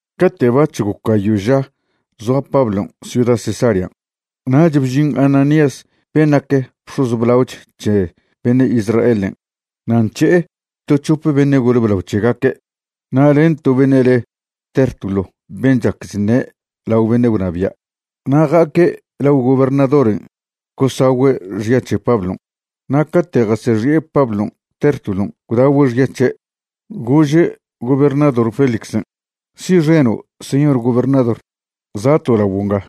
Cate' bac̱h goc gayo' ža zoa Pablon' ciuda Cesarean', nach bžin Ananías ben' nac bx̱oz blaoch c̱he beṉe' Israelen' na' nc̱he'e to c̱hope beṉe' gole blao c̱hegaque' na' len to beṉe' le Tértulo ben' chac chṉe' lao beṉe' gwnabia'. Na' ja'aque' lao gobernadoren' gosagüe' xya c̱he Pablon'. Na' cate' jasexi'e Pablon', Tértulon' gwdagüe' xya c̱he', gože' gobernador Félixen': ―Si'xeno', señor gobernador, za'to' laguo' nga.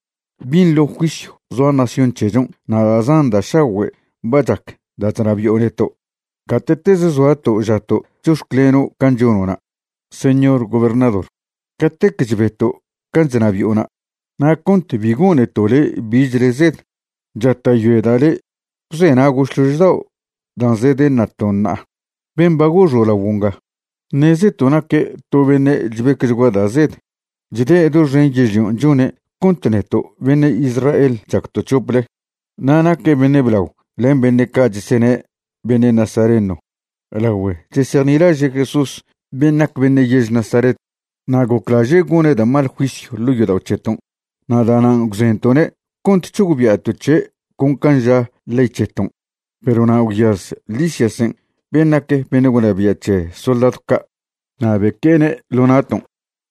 Binḻo juisyw zoa nación c̱hechon' na' da' zan da' šagüe' ba chac da' chnabi'o neto'. Gate'tez zoato' žato' chox̱cleno' can' chono'na', señor gobernador, catec chbeto' can' chnabi'ona'. Na' cont bi goneto' le' bichle zed, chata'yoeda' le' gwzenago' šlož dao' dan' zedeṉato' ṉa'a. Ben' ba goxo' laguo' nga, ṉezeto' naque' to beṉe' chbecchgua da' zed. Chde' doxen yežlion' chone' cont neto' beṉe' Israel chacto' c̱hople. Na' naque' beṉe' blao len beṉe' ca' chesene' beṉe' nazareno lagüe chesejnilaže' Jesús ben' nac beṉe' yež Nazaret. Na' goclaže' gone' da' mal juisyw ḻo' yodao' c̱heton' na' da'nan' gwzento'ne' cont c̱hogbia'to' c̱he' con can' ža ley c̱heton'. Perw na' gwyaz Lisiasen' ben' nac beṉe' gwnabia' c̱he soldadw ca' na' beque'ene' ḻo na'ton'.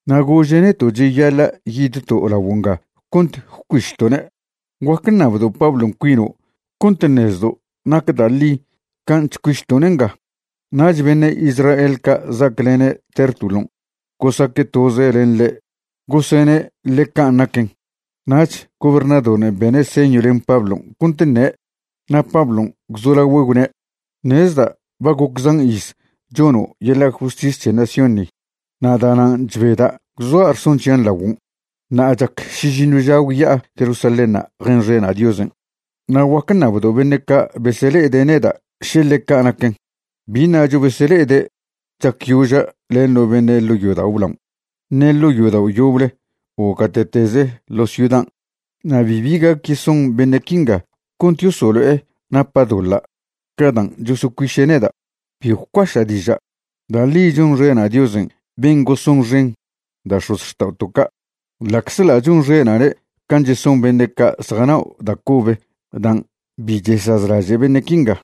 Na' gože' neto' cheyaḻa' yidto' laguo' nga cont gwcuišto'ne'. Guac ṉabdo' Pablon' cuino' cont ṉezdo' nac da' ḻi can' chcuišto'ne' nga. Nach beṉe' Israel ca' za'aclene' Tértulon' gosaque' toze len ḻe' gosene' ḻe can' naquen. Nach gobernadoren' bene' señw len Pablon' cont ṉe', na' Pablon' gwzolagüe' gwne': ―Ṉezda' ba goc zan iz chono' yeḻa' justis c̱he nación ni, na' da'nan' chbeda' gwzoa' rson c̱hian' laguon'. Ṉa'a chac šižiṉw ža gwya'a Jerusalénṉa' jenxena' Diosen'. Na' guac ṉabdo' beṉe' ca' besele'e neda' še ḻeca' naquen. Bi ṉacho besele'ede' chacyoža' len no beṉe' ḻo' yodao' blaon' ṉe ḻo' yodao' yoble o gate'teze ḻo ciudan'. Na' bibi gac yeson beṉe' quinga cont yosolo'e napa' doḻa' ca dan' chosocuiše' neda'. Bi gwcuaša' diža', da' ḻi chonxena' Diosen' ben' gosonxen da' x̱ozxta'oto' ca', ḻa'czḻa' chonxena'ne' can' cheson beṉe' ca' zjanao' da' cobe dan' bi chesazlaže' beṉe' quinga,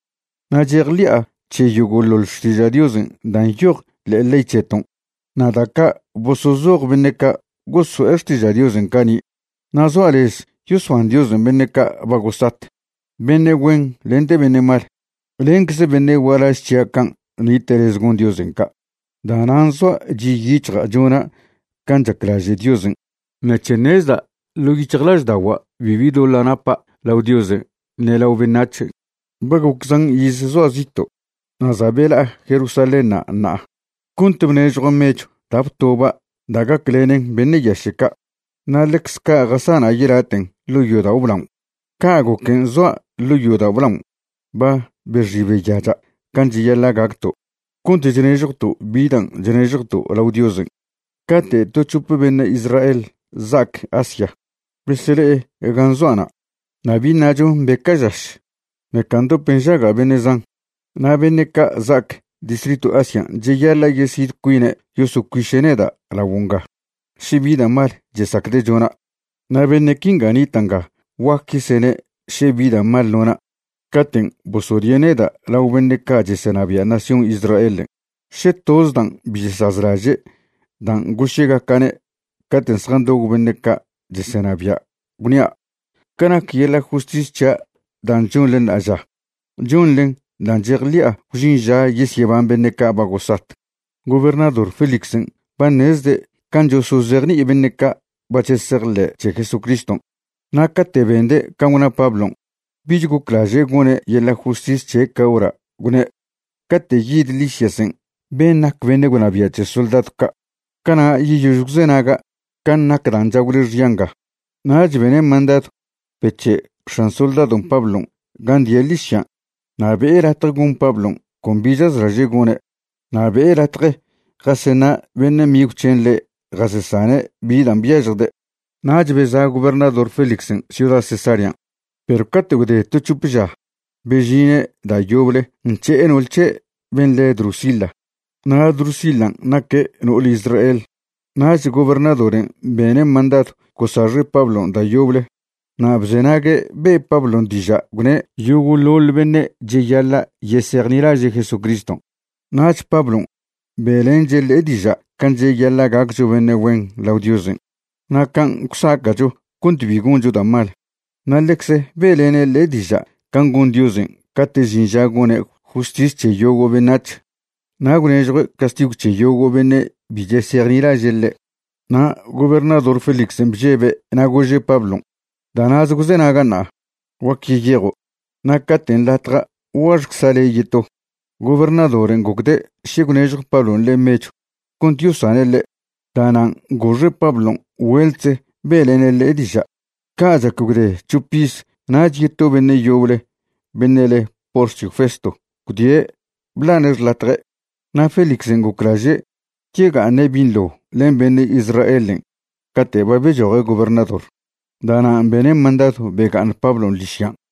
na' chejḻi'a c̱he yogo'ḻoḻ Xtiža' Diosen' dan' nyoj ḻe'e ley c̱heton' na' da' ca' bosozoj beṉe' ca' goso'e xtiža' Diosen' cani'. Na' zoa' lez yosban Diosen' beṉe' ca' ba gosat, beṉe' güen lente beṉe' mal. Lencze beṉe' gualaž c̱hia' can' nite' lez gon Diosen' ca'. Da'nan' zoa' chi' yic̱hja' chona' can' chaclaže' Diosen' ṉec̱he ṉezda' ḻo' yic̱hjlažda'ogua' bibi doḻa' napa' lao Diosen' ṉe lao beṉac̱hen'. ’Ba goc zan iz zoa' zito' na' za' bela'a Jerusalénṉa' ṉa'a cont bnežjua' mechw da' btoba' da' gaclenen beṉe' yaše' ca', na' ḻecz ca' jasana' yelaten' ḻo' yodao' blaon'. Ca' goquen' zoa' ḻo' yodao' blaon' ba bexi beyacha' can' cheyaḻa' gacto' cont chnežjwto' bi dan' chnežjwto' lao Diosen', cate' to c̱hope beṉe' Israel za'ac Asia besele'e gan' zoa'na'. Na' bi ṉacho mbeca' žaš, ṉeca ndop nžaga' beṉe' zan. Na' beṉe' ca' za'ac distritw Asian' cheyaḻa' yesid cuine' yosocuiše' neda' laguo' nga še bi da' mal chesacde' chona'. Na' beṉe' quinga nita' nga guac yesene' še bi da' mal nona' caten' bosodie' neda' lao beṉe' ca' chesenabia' nación Israelen'. Še toz dan' bi chesazlaže' dan' goše'gaca'ne' caten' zjandob beṉe' ca' chesenabia', gwnia': “Ca nac yeḻa' justis c̱hia' dan' chonḻe ṉa'aža, chonḻen dan' chejḻi'a gwžin ža yesyeban beṉe' ca' ba gosat.” Gobernador Félixen' ba ṉezde' can' chosozejni'i beṉe' ca' ba chesejḻe' c̱he Jesucriston', na' cate' bende' can' gwna Pablon', bich goclaže' gone' yeḻa' justis c̱he' ca hora', gwne': ―Cate' yid Lisiasen' ben' nac beṉe' gwnabia' c̱he soldadw ca', cana' yeyož gwzenaga' can' nac dan' chagwle xya nga. Nach bene' mandadw bec̱he' x̱an soldadon' Pablon' gan' die' ḻižyan' na' be'e latje gon Pablon' con bi chaclaže' gone', na' be'e latje jaseṉa' beṉe' migw c̱hen' ḻe' jasesane' bi dan' byažjde'. Nach beza' gobernador Félixen' ciuda Cesarean', perw cate' gwde to c̱hope ža bežine' da' yoble nc̱he'e no'ol c̱he' ben' le Drusila. Na' Drusilan' naque' no'ole Israel. Nach gobernadoren' bene' mandadw gosaxe' Pablon' da' yoble na' bzenague' be' Pablon' diža' gwne' yogo'ḻoḻ beṉe' cheyaḻa' yesejnilaže' Jesucriston'. Nach Pablon' be'lenche' ḻe' diža' can' cheyaḻa' gaccho beṉe' güen lao Diosen', na' can' gwsaca'cho cont bi goncho da' mal, na' ḻecze be'lene' ḻe' diža' can' gon Diosen' cate' žin ža gone' justis c̱he yogo' beṉac̱h na' gwnežjue' castigw c̱he yogo' beṉe' bi chesejnilaže' ḻe'. Na' gobernador Félixen' bžebe' na' gože' Pablon': ―Da' na'ze gwzenaga' ṉa'a, guac yeyejo'. Na' cate' nḻatja' guaxcza' le' yeto. Gobernadoren' gocde' še gwnežjo Pablon' ḻe' mechw cont yosane' ḻe'. Da'nan' goxe' Pablon' güeltze be'lene' ḻe' diža'. Ca' chac gwde c̱hop iz nach yeto beṉe' yoble beṉe' le Porcio Festo gwdie' bḻane' xḻatje'. Na' Félixen' goclaže' yega'aṉe' binḻo len beṉe' Israelen' cate' ba bechoje' gobernador, da'nan' bene' mandadw bega'aṉ Pablon' ḻižyan'.